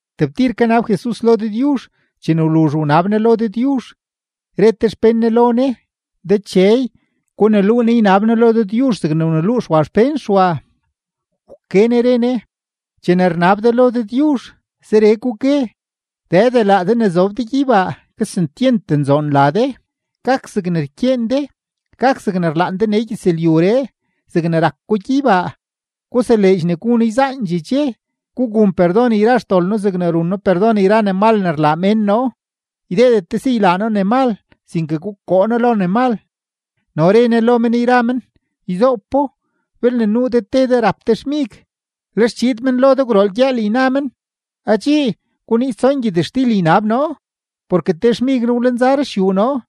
Tebtir kanab Jesus lo Dëdyuzh; chene wluzh wnab Ne lo Dëdyuzh, re te xpén Ne lo Ne: ―Dechey, guneluu noo ynab noo lo Dëdyuzh zegne wneluu Xwa xpén Xwa. Wke Ne re Ne: ―Chene rnab de lo Dëdyuzh, zeree gugue: Dëde, laa de ne zob de gyeybaa, kesentyent nzoon la de. Gak zegne rkyeen de. Gak zegne rlaan de nee gyëzlyuree zegne rak ko gyeybaa. Guseleedx ne gu noo yzaandxee dxe. Gugun perdon yra xdol noo zegne run noo perdon yra ne mal ne rlaa mén noo. Ydeedet de si ylaa noo ne mal, sinke gukoo noo lo ne mal. No re Ne lo men yra men: ―Yzoopo, belne nuu de te de rap te xmig, lex chiid men lo de gwrool gyëël yna men: “Adxii, guniiz tson gyëtxtil ynab noo, porke te xmig noo wlenza ruxyuu noo,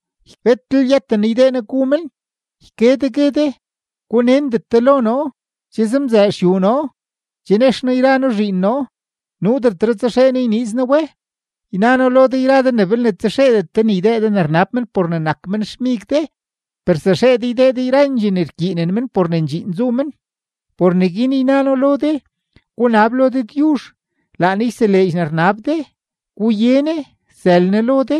betlel yëten noo ydee noo gu men.” Yke de, gue de: “Gunendet de lo noo. Che zemzëë xyuu noo, che nex noo yra noo zhiin noo. Nuudetre tsaxee noo yniiz noo we.” Yna noo lo de yra de ne belne tsaxeedet de ne ydee de ne rnab men por ne nak men xmig de, per zaxee de ydee de yrandxee ne rkyiinen men por ne ndxiin zu men. Por neguin yna noo lo de: Gunab lo Dëdyuzh, laa Ne yseleedx ne rnab de; guye Ne, sël Ne lo de;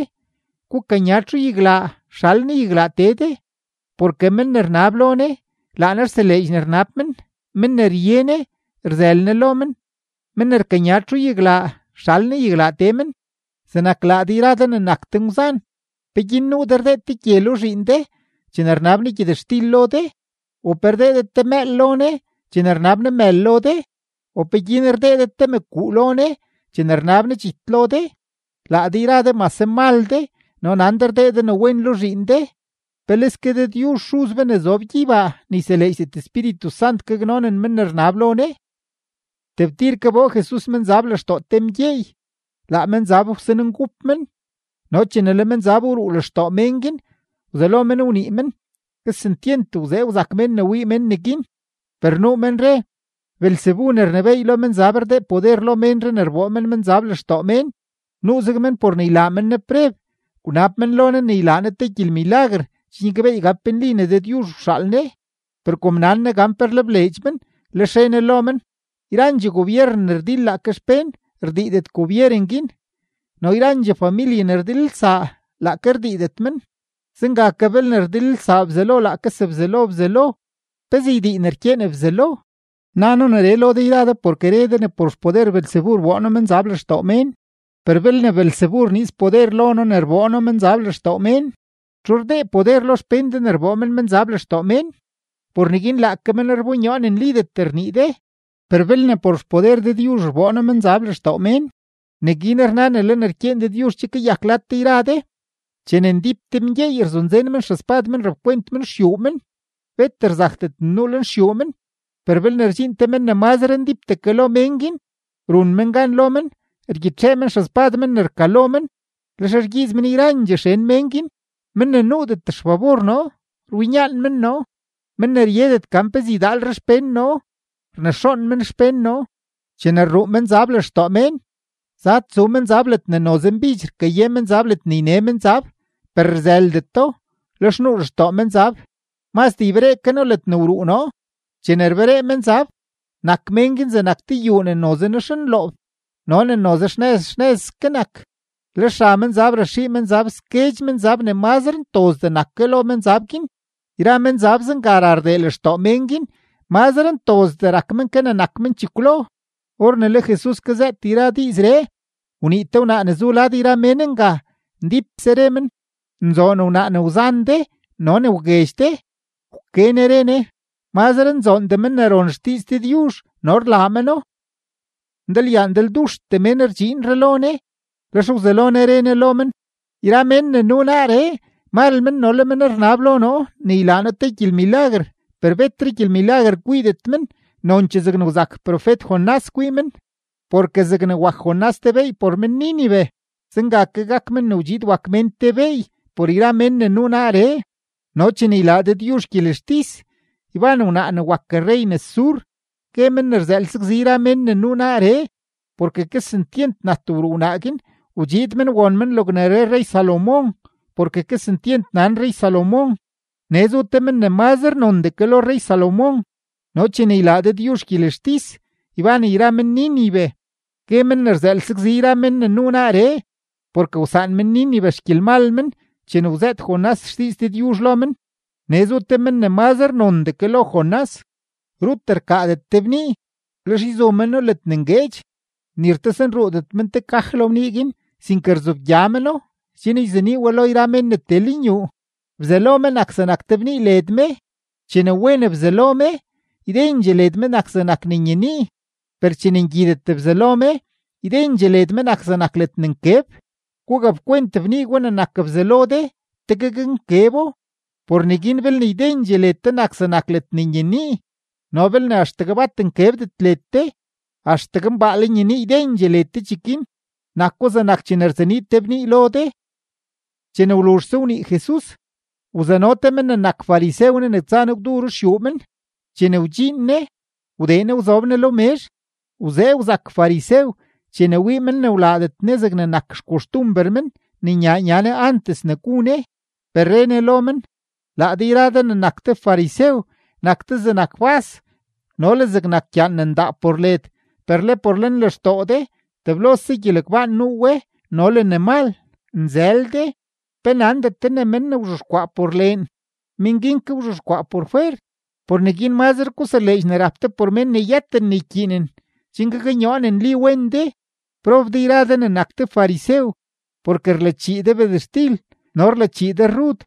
gukanya txuyaglaa, sxal Ne yaglaa tee de. Porke men ne rnab lo Ne, laa Ne rseleedx ne rnab men; men ne rye Ne, rzël Ne lo men; men ne rkanya txuyaglaa, sxal Ne yaglaa tee men. ’Zegnak laa de yra de ne nak ngwzan, ¿peguin nuu de rdee te gye lo zhiin de chene rnab ne gyëtxtil lo de? ¿U pe rdee de te mëël lo ne chene rnab ne mël lo de? ¿U peguin rdee de te mëkuu lo ne chene rnab ne dxit lo de? Laa de yra de mase mal de no nan de rdee de ne wen lo zhiin de, ¡peleske Dëdyuzh Xuz be ne zob gyeybaa ne yseleedxdet Espíritu Sant gaknonen men ne rnab lo Ne! Tebtir kaboo Jesus menzab lextoo te mgyeey; laa menzab wsanengup men, no chene le menzab wruu lextoo mén guin, wzelo men wnii men. Kesentyent wzee wzak mén ne wii men neguin. Per nuu men re: ―Beelzebu ne rnebééy lo menzab rdee poder lo ménree ne rboo men menzab lextoo mén. Nuuzeg men por ne ylaa men Ne preb, wnab men lo Ne ne ylaa Ne te gyelmilaguer chen gyakbeey gan pe nli ne Dëdyuzh wxaal Ne. Per kom nan Ne gan pe rlebleedx men, lex re Ne lo men: ―Yrandxee gobyeren ne rdil laake xpén, rdiidet gobyeren guin; no yrandxee familye ne rdilelsaa, laake rdiidet men. Zenga ke, belne rdilelsaa Bzelo laake yra sebzelo Bzelo, ¿pezee ydii ne rkyeen Bzelo? Na noo neree lo de yra de porke re de ne por xpoder Beelzebu rboo noo menzab lextoo mén; per belne Beelzebu rniiz poder lo noo ne rboo noo menzab lextoo mén, ¿txu rdee poder lo xpén de ne rboo men menzab lextoo mén? Por neguin laake men rbonyoo ne nlidet rnii de. Per belne por xpoder Dëdyuzh rboo noo menzab lextoo mén, neguin rna ne le ne rkyeen Dëdyuzh che kayak lad de yra de. ’Chene ndíp te mgyeey rzunzen men xespad men rapkwent men xyuu men, bet rzakdet ne nuu lenxyuu men. Per belne rdxiin te men ne mazre ndípdee ke lo mén guin, run men gan lo men; rgyitxee men xespad men ne rkalo men, lex rgyiiz men yrandxee xen mén guin. ’Men ne nuudet xfabor noo, rwinyaan men noo; men ne ryedet gan pezee ydaalre xpén noo, rnexoon men xpén noo. ’Chene rruu menzab lextoo mén, zad tsu menzab ledne noze mbidx rkaye menzab ledne yne menzab, per rzëldeto. Lex nuu lextoo menzab: “Mazdee yberee ke noo ledne wruu noo.” Chene rberee menzab, nak mén guin zegnak te yuu ne noze nexnloob no ne noze xnëz xnëzske nak. Lex ra menzab raxii menzab sguedx menzab ne mazre ntozdee nak ke lo menzab guin; yra menzab zenga ra rdee lextoo mén guin; mazre ntozdee rak men ke ne nak men chekwlo. Or ne le Jesus kazëët yra diizree, wnii te wnaa ne zu lad yra mén nga, ndípse re men: ―¡Nzoon wnaa ne wzan de no ne wguedx de! Wke Ne re Ne: ―¡Mazre nzoondee men ne ron xdiiz Dëdyuzh no rlaa meno! Ndalyaa ndalduxtee mén rdxiinre lo Jesus, lex wzelo Ne re Ne lo men: ―Yra mén ne nuu naaree, mal men no le men rnab lo noo ne ylaa noo te gyelmilaguer, per betre gyelmilaguer kwiidet men, nonchee zegne wzak profet-Jonás kwii men. Porke zegne wak Jonás te beey por men-Nínive, zenga ke gak Men ne wdxiid wak Mén te beey por yra mén ne nuu naaree. No chene ylaa Dëdyuzh gyelextis, yban wnaa ne wak rrey nes Sur, gue men ne rzëël sakzi yra men ne nuu naaree. Porke kesentyent nat wruu wnaa guin wdxiid men won men logne re rrey-Salomón porke kesentyent nan rrey-Salomón; nee zu te men ne mazre nondee ke lo rrey-Salomón. No chene ylaa Dëdyuzh gyelextis, yban yra men-Nínive, gue men ne rzëël sakzi yra men ne nuu naaree; porke wsaan men-Nínive xgyelmal men chene wzëët Jonás xdiiz Dëdyuzh lo men; nee zu te men ne mazre nondee ke lo Jonás. ’Rut rkaadet te bnii, lex yzu meno ledne ngueedx, ni rtosenruudet men te kaj lo bnii guin, sinke rzobgya meno chen yzenii we lo mén ne tee lenyuu. Bzalo me nak zegnak te bnii led me; chene wen bzalo me, ydendxee led me nak zegnak ledne nyenii. Per chene ngyidet bzalo me, ydendxee led me nak zegnak ledne nkeb. Gugapkwent bnii gwa ne nak bzalo de, tegue gaknkebo. Por neguin belne ydendxee led de nak zegnak ledne nyenii no belne axtegue bat nkebdet led de, axtegue mbaale nyenii ydendxee led de cheguin; nako zegnak chene rzenii te bnii lo de. Chene wluzhse wnii Jesus, wzano te men ne nak farisew Ne ne tsa Ne gwdu ruxyuu men. Chene wdxiin Ne, wdee Ne wzob Ne lo mezh. Wzee wzak farisew chene wii men ne wlaadet Ne zegne nak xkoxtumber men ne nyaa nya Ne antes ne gu Ne. Per re Ne lo men: ―Laa de yra de ne nak de farisew, nak de zegnak bas no le zegnak gyaan ne ndaa por led, per le por lenlextoo de teblose gyelegbaan nuu we no le ne mal. ¡Nzël de! ¿Pe nandet de ne men ne wzhexkwaa por leen, men guin ke wzhexkwaa por fwer? Por neguin mazre guseleedx ne rap de por mén ne yëten ne ykyiinen, chen gaknyoo ne nli wen de. ’¡Prob de yra de ne nak de farisew! Porke rlachii de bedextil no rlachii de rrud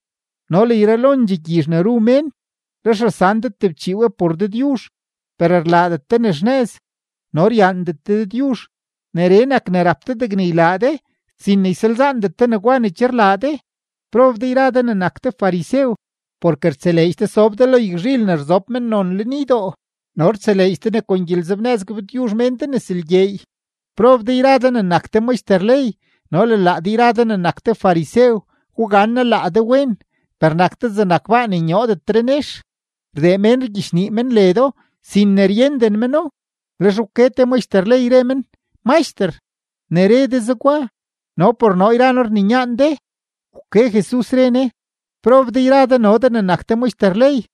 no le yralondxee gyizh ne ru mén, lex rasan de tebchii we por Dëdyuzh, per rlaadet de ne xnëz no ryaandet de Dëdyuzh. Neree nak ne rap de degne ylaa de, sin ne ysalzaandet de negwa ne che rlaa de. ’¡Prob de yra de ne nak de farisew! Porke rtseleedx de sob de lo yagzhil ne rzob mennon lenydoo no rtseleedx de ne kon gyelenzebnëz gabtyuzh mén de nes lgyeey. ’¡Prob de yra de ne nak de maxter ley no le yra de ne nak de farisew, gugannaa laa de wen! Per nak de zegnak baa ne nyoodetre nex; rdee mén rgyichnii men ledo sin ne ryenden meno. Lex wke te maxter ley, re men: ―Maxter, ne re de zegwa, no por noo yra noo rninyaan de. Wke Jesus, re Ne: ―¡Prob de yra de no de ne nak de maxter ley!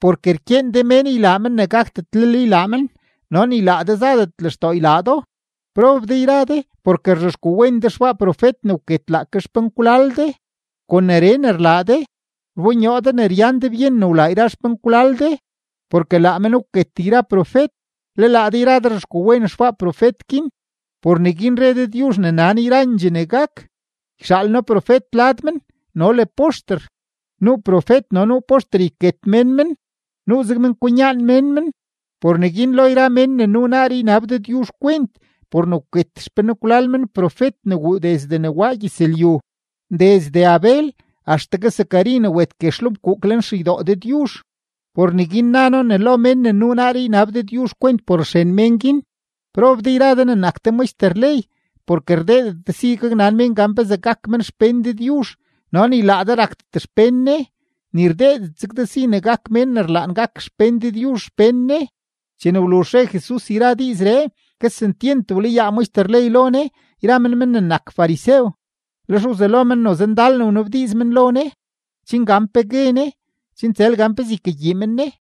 Porke rkyeen de mén ylaa men ne gakdetlel ylaa men, no ni laa de zadet lextoo ylaa do. ’¡Prob de yra de! Porke rzhexkwawen de xbaa profet ne wket laake xpenkwlal de. Kon neree ne rlaa de, rbonyoo de ne ryan de byen ne wlaa yra xpenkwlal de, porke laa men wket yra profet, le laa de yra de rzhexkwawen xbaa profet guin. ’Por neguin re Dëdyuzh ne nan yrandxee ne gak: “Yxaal noo profet lad men no le poxter; nuu profet no nuu poxter yket mén men; nuuzeg men kwinyaan mén men.” Por neguin lo yra mén ne nuu naaree ynab Dëdyuzh kwent por ne wket xpenkwlal men profet ne wuu desde ne waa gyëzlyu, desde Abel axtegue Zacari ne wet guex lo fkuuk lenxeydoo Dëdyuzh. Por neguin na noo ne lo mén ne nuu naaree ynab Dëdyuzh kwent por xren mén guin. ’¡Prob de yra de ne nak de maxter ley! Porke rdeedet de si gaknan mén gan pezee gak men xpén Dëdyuzh, no ni laa de rakdet xpén Ne, ni rdeedet zeg de si ne gak mén ne rlaan gak xpén Dëdyuzh xpén Ne. Chene wluzh re Jesus yra diizree, kesentyent wlayaa maxter ley lo Ne yra men men ne nak farisew. Lex wzelo men noze ndal ne wnabdiiz men lo Ne, chen gan pe gue Ne, chen tsël gan pezee ykagyii men Ne.